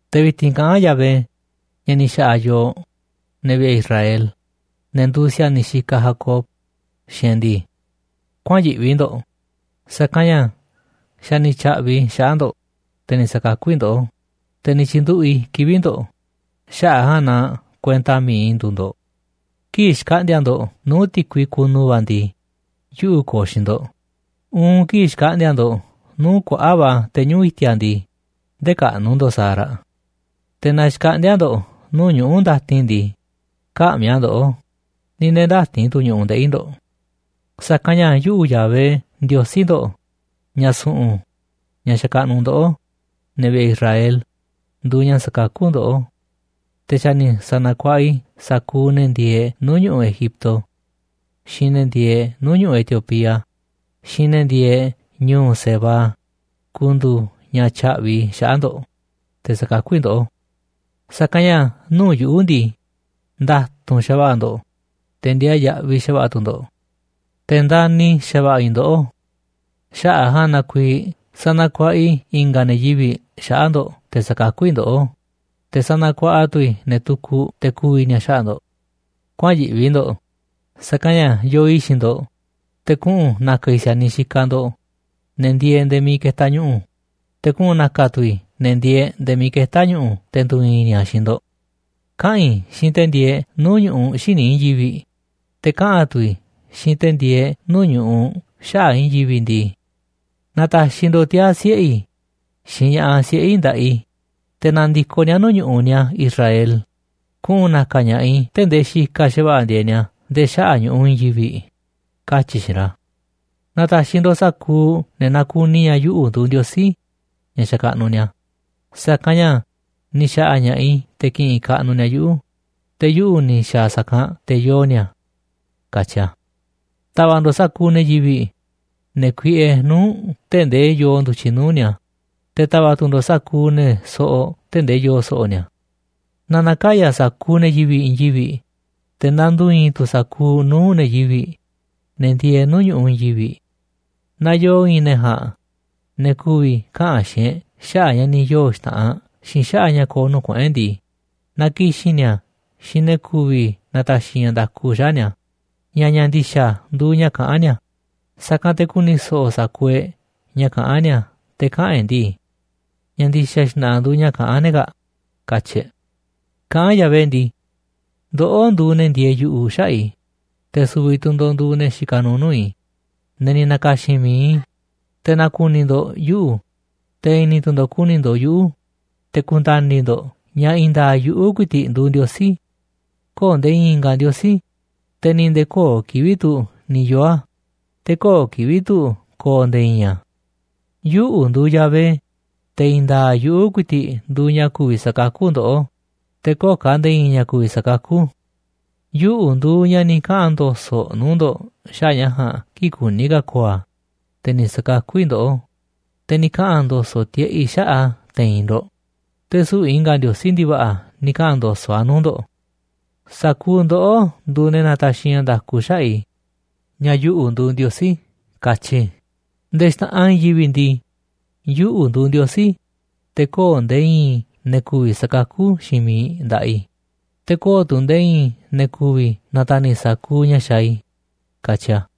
Te̱ vi̱ti̱n kaꞌán Yahvé, ña̱ ni̱ xa̱ꞌa̱ yooꞌ, ne̱ vi̱ꞌe̱ Israel, ne̱ nduuꞌ si̱a̱niꞌ xikaꞌ Jacob, xiinꞌ e̱ꞌ ndii: “Kuäa̱n yiꞌvi ndo̱ꞌ, sa̱kanꞌ ña̱ xa̱ ni̱ tya̱ꞌvi̱ i̱ xaꞌa̱ꞌ ndo̱ꞌ, te̱ ni̱ sa̱kakú i̱ ndoꞌó, te̱ ni̱ tyi̱nduꞌu̱ꞌ i̱ kivi̱ꞌ ndo̱ꞌ, xaꞌa̱ꞌ a̱ ja̱a̱nꞌ na kuenta mi̱iꞌ i̱ nduuꞌ ndo̱ꞌ. Kii̱ꞌ xkaꞌndi̱a̱ ndo̱ꞌ nuu̱ꞌ ti̱kui kunu va̱ ndii, yuꞌu̱ ko̱o̱ xiinꞌ ndo̱ꞌ, uun kii̱ꞌ xkaꞌndi̱a̱ ndo̱ꞌ nuu̱ꞌ kuaꞌa̱ꞌ va̱ te̱ñuꞌu̱ꞌ i̱ti̱a̱ ndii, ndë̱kaꞌnu̱ ndo̱ꞌ sa̱a̱ raꞌ. Te̱ naa xkaꞌndíá ndo̱ꞌ nuu̱ꞌ ñuꞌu̱ ndatin ndii, kä̱ꞌmi̱ a̱ ndoꞌó, ni̱ nde̱e̱ ndä̱ti̱n tu̱ ñu̱ꞌuꞌ ndeꞌi̱ ndo̱ꞌ. Sa̱kanꞌ ña̱ yuꞌu̱, Yahvé Ndiosí ndo̱ꞌ, ña̱ su̱ꞌu̱n, ña̱ xakaꞌnuꞌ ndoꞌó, ne̱ vi̱ꞌe̱ Israel, nduuꞌ ña̱ sakakú ndoꞌó. Te̱ xa̱ ni̱ sa̱na̱kuaꞌa i̱ sa̱kuuꞌ ne̱ ndieeꞌ nuu̱ꞌ ñu̱ꞌuꞌ Egipto xiinꞌ ne̱ ndieeꞌ nuu̱ꞌ ñu̱ꞌuꞌ Etiopía xiinꞌ ne̱ ndieeꞌ ñu̱u̱ Seba ku̱ndu̱u̱ ña̱ tya̱ꞌvi̱ i̱ xaꞌa̱ꞌ ndo̱ꞌ, te̱ sa̱kakú i̱ ndoꞌó. Sa̱kanꞌ ña̱ nuu̱ꞌ yuꞌu̱ ndii, nda̱tu̱nꞌ xa̱va̱ꞌa̱ ndo̱ꞌ, te̱ ndiaa yaꞌviꞌ xa̱va̱ꞌa̱ tu̱ ndo̱ꞌ, te̱ ndani̱ xa̱va̱ꞌa̱ i̱ ndoꞌó. Xaꞌa̱ꞌ a̱ ja̱a̱nꞌ na kuiiꞌ sanakuaꞌa i̱ i̱nga̱ ne̱ yivi̱ꞌ xaꞌa̱ꞌ ndo̱ꞌ te̱ sa̱kakú i̱ ndoꞌó, te̱ sanakuaꞌa tu̱ i̱ ne̱ tukuꞌ te̱ ku̱vi̱ ni̱a̱ xaꞌa̱ꞌ ndo̱ꞌ. Kuäa̱n yiꞌvi ndo̱ꞌ, sa̱kanꞌ ña̱ yoo i̱ xiinꞌ ndo̱ꞌ, te̱ kuꞌu̱n na̱ka̱ i̱ si̱a̱niꞌ xikaꞌ ndo̱ꞌ, ne̱ ndieeꞌ nde̱e̱ miiꞌ ketaꞌ ñu̱ꞌu̱. Te̱ kuꞌu̱n na̱ka̱ tu̱ i̱ ne̱ ndieeꞌ nde̱e̱ miiꞌ ketá ñu̱ꞌu̱ te̱ ndu̱i̱i̱n ni̱a̱ xiinꞌ ndo̱ꞌ. Kaꞌa̱n i̱ xiinꞌ te̱ ndieeꞌ nuu̱ꞌ ñu̱ꞌuꞌ xíniꞌ i̱i̱n yivi̱ꞌ, te̱ kaꞌa̱n tu̱ i̱ xiinꞌ te̱ ndieeꞌ nuu̱ꞌ ñu̱ꞌuꞌ xaꞌa̱ꞌ i̱i̱n yivi̱ꞌ ndii: Na̱ta̱xi̱ ndo̱ꞌ tiaa̱ siꞌe̱ i̱, xiinꞌ ña̱ꞌaꞌ siꞌe̱ i̱ nda̱ꞌaꞌ i̱, te̱ na̱ndi̱koꞌ ni̱a̱ nuu̱ꞌ ñu̱ꞌuꞌ ni̱a̱ Israel, kuꞌu̱n na̱ka̱ ña̱ꞌaꞌ i̱ tee̱ꞌ ndee xikaꞌ xa̱va̱ꞌa̱ ndieeꞌ ni̱a̱ nde̱e̱ xaꞌa̱ꞌ ñu̱ꞌuꞌ i̱i̱n yivi̱ꞌ, katyi̱ i̱ xiinꞌ ra̱. Na̱ta̱xi̱ ndo̱ꞌ sa̱kuuꞌ ne̱ nakuni ña̱ yuꞌu̱ nduuꞌ Ndiosí, ña̱ xakaꞌnuꞌ ni̱a̱, sa̱kanꞌ ña̱ ni̱ xa̱ꞌa̱ ña̱ꞌaꞌ i̱ te̱ ki̱ꞌi̱n kaꞌnuꞌ ni̱a̱ yuꞌu̱, te̱ yuꞌu̱ ni̱ xa̱a̱ sa̱kanꞌ te̱ yoo ni̱a̱”, katyi a̱. Ta̱va̱ꞌ ndo̱ꞌ sa̱kuuꞌ ne̱ yivi̱ꞌ, ne̱ kuiꞌe nuu̱ꞌ tee̱ꞌ ndee yoo ndu̱tyiꞌ nuu̱ꞌ ni̱a̱, te̱ ta̱va̱ꞌ tu̱ ndo̱ꞌ sa̱kuuꞌ ne̱ soꞌoꞌ tee̱ꞌ ndee yoo so̱ꞌo̱ ni̱a̱. Na na̱kaya̱ sa̱kuuꞌ ne̱ yivi̱ꞌ i̱i̱n yivi̱ꞌ, te̱ na ndu̱i̱i̱n sa̱kuuꞌ nuu̱ꞌ ne̱ yivi̱ꞌ, ne̱ ndieeꞌ nuu̱ꞌ ñu̱ꞌuꞌ i̱i̱n yivi̱ꞌ. Naaꞌ yoo i̱i̱n ne̱ ja̱a̱nꞌ, ne̱ ku̱vi̱ kaꞌa̱n xiinꞌ e̱ꞌ xaꞌa̱ꞌ ña̱ ni̱ yoo̱ xta̱ꞌanꞌ xiinꞌ xaꞌa̱ꞌ ña̱ ko̱o̱ nuu̱ꞌ kuꞌu̱n e̱ꞌ ndii, na ki̱xi̱n ni̱a̱ xiinꞌ ne̱ ku̱vi̱ na̱ta̱xi̱ ña̱ nda̱ku xaꞌa̱ꞌ ni̱a̱ ña̱ ña̱ ndi̱xa̱ nduuꞌ ña̱ kaꞌán ni̱a̱, sa̱kanꞌ te̱ ku̱ni̱ so̱ꞌo̱ sa̱kuuꞌ e̱ꞌ ña̱ kaꞌán ni̱a̱ te̱ kaꞌa̱n e̱ꞌ ndii: “Ña̱ ndi̱xa̱ xna̱ꞌa̱ nduuꞌ ña̱ kaꞌán ne̱ kaa̱ꞌ”, katyi̱ e̱ꞌ. Kaꞌán Yahvé ndii: “Ndoꞌó nduuꞌ ne̱ ndieeꞌ yu̱ꞌuꞌ xaꞌa̱ꞌ i̱, te̱ su̱vi̱ tu̱ ndo̱ꞌ nduuꞌ ne̱ xikaꞌ nuuꞌ nuu̱ꞌ i̱, ne̱ ni̱ na̱ka̱xi̱n mi̱iꞌ i̱, te̱ na̱ku̱ni̱ ndo̱ꞌ yuꞌu̱, te̱ i̱ni̱ tu̱ ndo̱ꞌ ku̱ni̱ ndo̱ꞌ yuꞌu̱, te̱ ku̱nda̱ni̱ ndo̱ꞌ ña̱ i̱i̱n nda̱a̱ꞌ yuꞌu̱ ku̱i̱ti̱ꞌ nduuꞌ Ndiosí. Köo̱ꞌ nde̱e̱ i̱i̱n i̱nga̱ ndiosí, te̱ ni̱i̱ nde̱e̱ köo̱ꞌ kivi̱ꞌ tu̱ ni̱ yoo̱ a̱, te̱ köo̱ꞌ kivi̱ꞌ tu̱ ko̱o̱ nde̱e̱ i̱i̱n a̱. Yuꞌu̱ nduuꞌ Yahvé, te̱ i̱i̱n nda̱a̱ꞌ yuꞌu̱ ku̱i̱ti̱ꞌ nduuꞌ ña̱ ku̱vi̱ sakakú ndoꞌó, te̱ köo̱ꞌ ka̱ nde̱e̱ i̱i̱n ña̱ ku̱vi̱ sakakú. Yuꞌu̱ nduuꞌ ña̱ ni̱ kaꞌa̱n ndo̱so̱ꞌ nuu̱ꞌ ndo̱ꞌ xaꞌa̱ꞌ ña̱ ja̱a̱nꞌ kii̱ꞌ kuní ka̱ ko̱o̱ a̱, te̱ ni̱ sa̱kakú i̱ ndoꞌó, te̱ ni̱ kaꞌa̱n ndo̱so̱ꞌ tiꞌeꞌ i̱ xaꞌa̱ꞌ a̱ te̱i̱n ndo̱ꞌ, te̱ süu̱ꞌ i̱nga̱ ndiosí ndi̱va̱ꞌa̱ ni̱ kaꞌa̱n ndo̱so̱ꞌ a̱ nuu̱ꞌ ndo̱ꞌ. Sa̱kuuꞌ ndoꞌó nduuꞌ ne̱ nataxiꞌ ña̱ nda̱ku xaꞌa̱ꞌ i̱ ña̱ yuꞌu̱ nduuꞌ Ndiosí, katyi i̱. Nde̱e̱ xta̱ꞌanꞌ i̱i̱n yivi̱ꞌ ndii, yuꞌu̱ nduuꞌ Ndiosí, te̱ köo̱ꞌ nde̱e̱ i̱i̱n ne̱ ku̱vi̱ sa̱kakú xiinꞌ miiꞌ nda̱ꞌaꞌ i̱, te̱ köo̱ꞌ tu̱ nde̱e̱ i̱i̱n ne̱ ku̱vi̱ na̱ta̱ni̱ sa̱kuuꞌ ña̱ xaaꞌ i̱”, katyi a̱.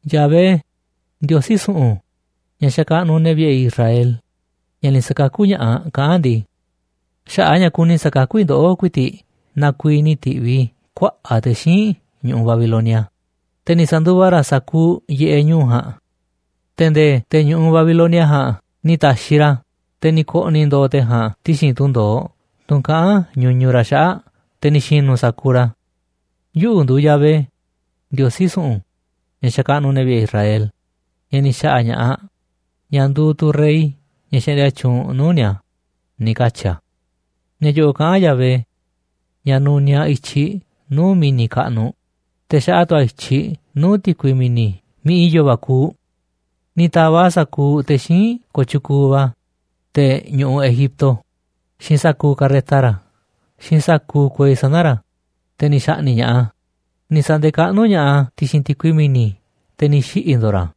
Yahvé, Ndiosí su̱ꞌu̱n, ña̱ xakaꞌnuꞌ ne̱ vi̱ꞌe̱ i̱ Israel, ña̱ ni̱ sa̱kakú ña̱ꞌaꞌ, kaꞌán ndii: “Xaꞌa̱ꞌ a̱ ña̱ kuni sa̱kakú i̱ ndoꞌó ku̱i̱ti̱ꞌ na kuiiꞌ ni̱ ti̱ꞌviꞌ i̱ kuaꞌa̱ꞌ te̱ xíinꞌ ñu̱ꞌu̱ Babilonia, te̱ ni̱ sa̱nduva ra̱ sa̱kuuꞌ yiꞌeꞌ ñu̱u̱ ja̱a̱nꞌ, te̱ nde̱e̱ te̱ ñu̱ꞌu̱ Babilonia ja̱a̱nꞌ ni̱ ta̱xiꞌ ra̱, te̱ ni̱ ko̱ꞌni̱ ndo̱o̱ te̱ ja̱a̱nꞌ ti̱xi̱n tunꞌ ndo̱oꞌ tunꞌ kaꞌán ñuñuꞌ ra̱ xaꞌa̱ꞌ te̱ ni̱ xi̱nu̱ sa̱kuuꞌ ra̱. Yuꞌu̱ nduuꞌ Yahvé, Ndiosí su̱ꞌu̱n, ña̱ xakaꞌnuꞌ ne̱ vi̱ꞌe̱ Israel, ña̱ ni̱ xa̱ꞌa̱ ña̱ꞌaꞌ, ña̱ nduuꞌ tu̱ rey ña̱ xaꞌndia tyuunꞌ nuu̱ꞌ ni̱a̱”, ni̱ katyi̱ a̱. Ña̱ yo̱ꞌo̱ꞌ kaꞌán Yahvé, ña̱ nuniaꞌ i̱tyiꞌ nuu̱ꞌ mi̱ni̱ kaꞌnuꞌ, te̱ xaꞌa tu̱ a̱ i̱tyiꞌ nuu̱ꞌ ti̱kui mi̱ni̱ miiꞌ i̱yo̱ va̱ kuuꞌ. Ni̱ ta̱va̱ꞌ a̱ sa̱kuuꞌ te̱ xíinꞌ kooꞌ tyukuuꞌ va̱, te̱ ñu̱ꞌu̱ Egipto xiinꞌ sa̱kuuꞌ karreta ra̱ xiinꞌ sa̱kuuꞌ kuei sana̱ ra̱, te̱ ni̱ xa̱ꞌni̱ꞌ ña̱ꞌaꞌ a̱. Ni̱ sa̱nde̱kaꞌnú ña̱ꞌaꞌ a̱ ti̱xi̱n ti̱kui mi̱ni̱, te̱ ni̱ xiꞌi̱ ndo̱o̱ ra̱,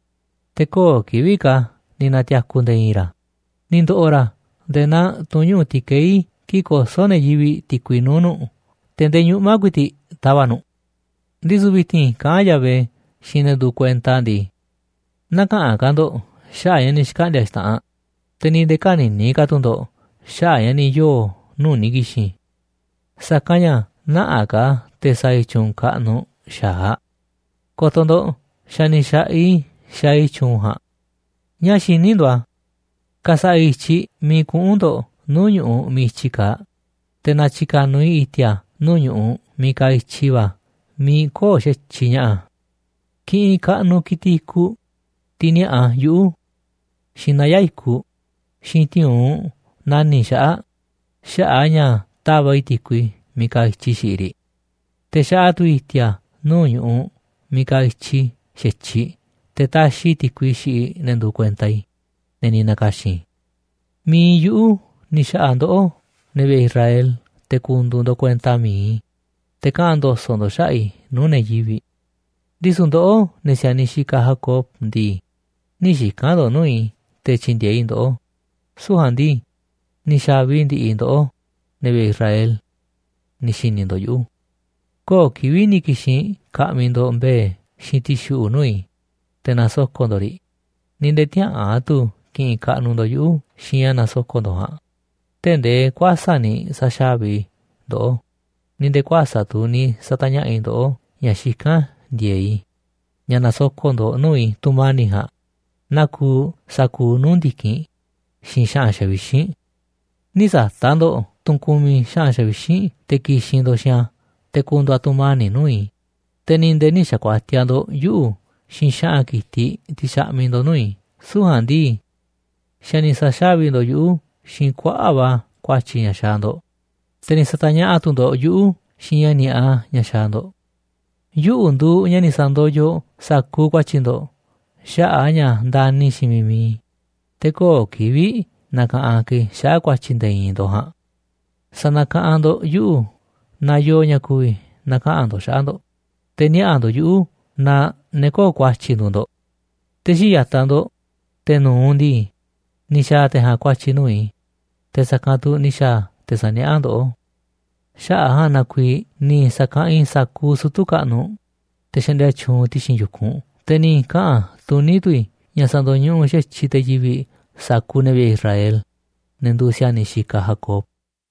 te̱ köo̱ꞌ kivi̱ꞌ ka̱ ni̱ na̱ti̱a̱ku̱ nde̱e̱ i̱i̱n ra̱, ni̱ ndo̱ꞌo̱ ra̱ nde̱e̱ naa tunꞌ ñuꞌu̱ ti̱kei̱ kii̱ꞌ kosó ne̱ yivi̱ꞌ ti̱kui nuu̱ꞌ nu̱ꞌ te̱ ndee ñuꞌma̱ ku̱i̱ti̱ꞌ tava̱ꞌ nu̱ꞌ. Ndisu̱ vi̱ti̱n kaꞌán Yahvé xiinꞌ ne̱ nduuꞌ kuenta a̱ ndii: “Näkaꞌanꞌ ka̱ ndo̱ꞌ xaꞌa̱ꞌ ña̱ ni̱ xkaꞌndi̱a̱ xta̱ꞌanꞌ, te̱ ni̱ nde̱e̱ kä̱ni̱ni̱ ka̱ tu̱ ndo̱ꞌ xaꞌa̱ꞌ ña̱ ni̱ yoo̱ nuu̱ꞌ ni̱ ki̱xi̱n. Sa̱kanꞌ ña̱ nä̱ꞌaꞌ ka̱ te̱ sa̱a̱ i̱ tyu̱u̱n kaꞌnuꞌ xa̱aꞌ. Ko̱to̱ ndo̱ꞌ xa̱ ni̱ xa̱ꞌaꞌ i̱ xaaꞌ i̱ tyu̱u̱n ja̱a̱nꞌ. ¿Ñáá xiní ndo̱ꞌ a̱? Ka̱sa̱ꞌa̱ i̱ i̱tyiꞌ miiꞌ kuꞌu̱n ndo̱ꞌ nuu̱ꞌ ñu̱ꞌuꞌ miiꞌ i̱tyi kaaꞌ, te̱ na̱tyi̱ka̱nuꞌ i̱ i̱ti̱a̱ nuu̱ꞌ ñu̱ꞌuꞌ miiꞌ kaaꞌ i̱tyi va̱ miiꞌ köo̱ꞌ xa̱tyiꞌ ña̱ꞌa̱. Kiꞌinꞌ kaꞌnuꞌ ki̱tiꞌ i̱kuꞌ, tiꞌ ni̱a̱ꞌa yuꞌu̱, xiinꞌ naya̱ꞌ i̱kuꞌ, xiinꞌ ti̱u̱unꞌ nani̱ꞌ xaꞌa̱ꞌ xaꞌa̱ꞌ a̱ ña̱ tava̱ꞌ i̱ ti̱kui miiꞌ kaaꞌ i̱tyiꞌ xiꞌiꞌ riꞌ. Te̱ xaꞌa tu̱ i̱ i̱ti̱a̱ nuu̱ꞌ ñu̱ꞌuꞌ miiꞌ kaaꞌ i̱tyi xa̱tyiꞌ te̱ taxiꞌ i̱ ti̱kui xiꞌiꞌ ne̱ nduuꞌ kuenta i̱, ne̱ ni̱ na̱ka̱xi̱n i̱. Mi̱iꞌ yuꞌu̱ ni̱ xa̱ꞌa̱ ndoꞌó, ne̱ vi̱ꞌe̱ Israel, te̱ ku̱ndu̱u̱ ndo̱ꞌ kuenta mi̱iꞌ i̱, te̱ kaꞌa̱n ndo̱so̱ꞌ ndo̱ꞌ xaꞌa̱ꞌ i̱ nuu̱ꞌ ne̱ yivi̱ꞌ. ’Ndisu̱ ndoꞌó, ne̱ si̱a̱niꞌ xikaꞌ Jacob ndii, nï̱ xika̱n ndo̱ꞌ nuu̱ꞌ i̱ te̱ tyi̱ndi̱e̱eꞌ i̱ ndoꞌó, süu̱ꞌ ja̱a̱nꞌ ndii, ni̱ xa̱vi ndi̱ꞌi̱ ndoꞌó, ne̱ vi̱ꞌe̱ Israel, ni̱ xi̱ni̱ ndo̱ꞌ yuꞌu̱. Köo̱ꞌ kivi̱ꞌ ni̱ ki̱xi̱n ka̱ꞌmi̱ ndo̱ꞌ mbe̱e̱ xiinꞌ ti̱xuꞌu̱ꞌ nuu̱ꞌ i̱, te̱ na̱soko̱ꞌ ndo̱ꞌ riꞌ, ni̱ nde̱e̱ tiäꞌa̱an tu̱ ki̱ꞌi̱n kaꞌnuꞌ ndo̱ꞌ yuꞌu̱ xiinꞌ ña̱ nasoko̱ꞌ ndo̱ꞌ ja̱a̱nꞌ, tee̱ꞌ ndee kuäsa̱ꞌ ni̱ sa̱xávi i̱ ndoꞌó, ni̱ nde̱e̱ kuäsa̱ꞌ tu̱ ni̱ sa̱ta̱ñaꞌa̱ꞌ i̱ ndoꞌó ña̱ xikán ndi̱e̱eꞌ i̱ ña̱ na̱soko̱ꞌ ndo̱ꞌ nuu̱ꞌ i̱ tu̱mani̱ꞌ ja̱a̱nꞌ naa kuuꞌ sa̱kuuꞌ nuu̱ꞌ ndi̱kinꞌ xiinꞌ xa̱ꞌa̱n xavixínꞌ. Nï̱ sa̱ta̱ꞌ ndo̱ꞌ tunꞌ kumiꞌ xa̱ꞌa̱n xavixínꞌ te̱ ki̱xi̱n ndo̱ꞌ xiinꞌ a̱ te̱ ku̱ndu̱u̱ a̱ tu̱mani̱ꞌ nuu̱ꞌ i̱, te̱ ni̱ nde̱e̱ nï̱ xa̱kuatiaꞌ ndo̱ꞌ yuꞌu̱ xiinꞌ xa̱ꞌa̱n ki̱tiꞌ tiꞌ xaꞌmiꞌ ndo̱ꞌ nuu̱ꞌ i̱. Süu̱ꞌ ja̱a̱nꞌ ndii, xa̱ ni̱ sa̱xávi ndo̱ꞌ yuꞌu̱ xiinꞌ kuaꞌa̱ꞌ va̱ ku̱a̱tyi̱ ña̱ xaaꞌ ndo̱ꞌ, te̱ ni̱ sa̱ta̱ñaꞌa̱ꞌ tu̱ ndo̱ꞌ yuꞌu̱ xiinꞌ ña̱ ni̱a̱ꞌa ña̱ xaaꞌ ndo̱ꞌ. Yuꞌu̱ nduuꞌ ña̱ ni̱ sa̱ndoyoꞌ sa̱kuuꞌ ku̱a̱tyi̱ ndo̱ꞌ xaꞌa̱ꞌ a̱ ña̱ ndani̱ xiinꞌ miiꞌ mi̱iꞌ i̱, te̱ köo̱ꞌ kivi̱ꞌ na̱ka̱ꞌanꞌ ka̱ i̱ xaꞌa̱ꞌ ku̱a̱tyi̱ nde̱e̱ i̱i̱n ndo̱ꞌ ja̱a̱nꞌ. Sa̱na̱kaꞌanꞌ ndo̱ꞌ yuꞌu̱ naaꞌ yoo ña̱ ku̱vi̱ na̱kaꞌa̱n ndo̱ꞌ xaꞌa̱ꞌ ndo̱ꞌ, te̱ niaꞌa̱ ndo̱ꞌ yuꞌu̱ naaꞌ ne̱ köo̱ꞌ ku̱a̱tyi̱ nduuꞌ ndo̱ꞌ. Te̱ xii̱ꞌ ya̱taꞌ ndo̱ꞌ, te̱ nu̱uꞌ ndii, ni̱ xa̱a̱ te̱ ja̱a̱nꞌ ku̱a̱tyi̱ nuu̱ꞌ i̱, te̱ sa̱kanꞌ tu̱ ni̱ xa̱a̱ te̱ sa̱niaꞌá ndoꞌó. Xaꞌa̱ꞌ a̱ ja̱a̱nꞌ na kuiiꞌ ni̱ sa̱kaꞌanꞌ i̱ sa̱kuuꞌ sutu̱ kaꞌnuꞌ, te̱ xaꞌndia tyuunꞌ ti̱xi̱n yu̱kunꞌ, te̱ ni̱ kaꞌa̱n tuní tu̱ i̱ ña̱ sa̱ndo̱ñuꞌuꞌ xa̱tyiꞌ te̱ yivi̱ꞌ sa̱kuuꞌ ne̱ vi̱ꞌe̱ Israel, ne̱ nduuꞌ si̱a̱niꞌ xikaꞌ Jacob.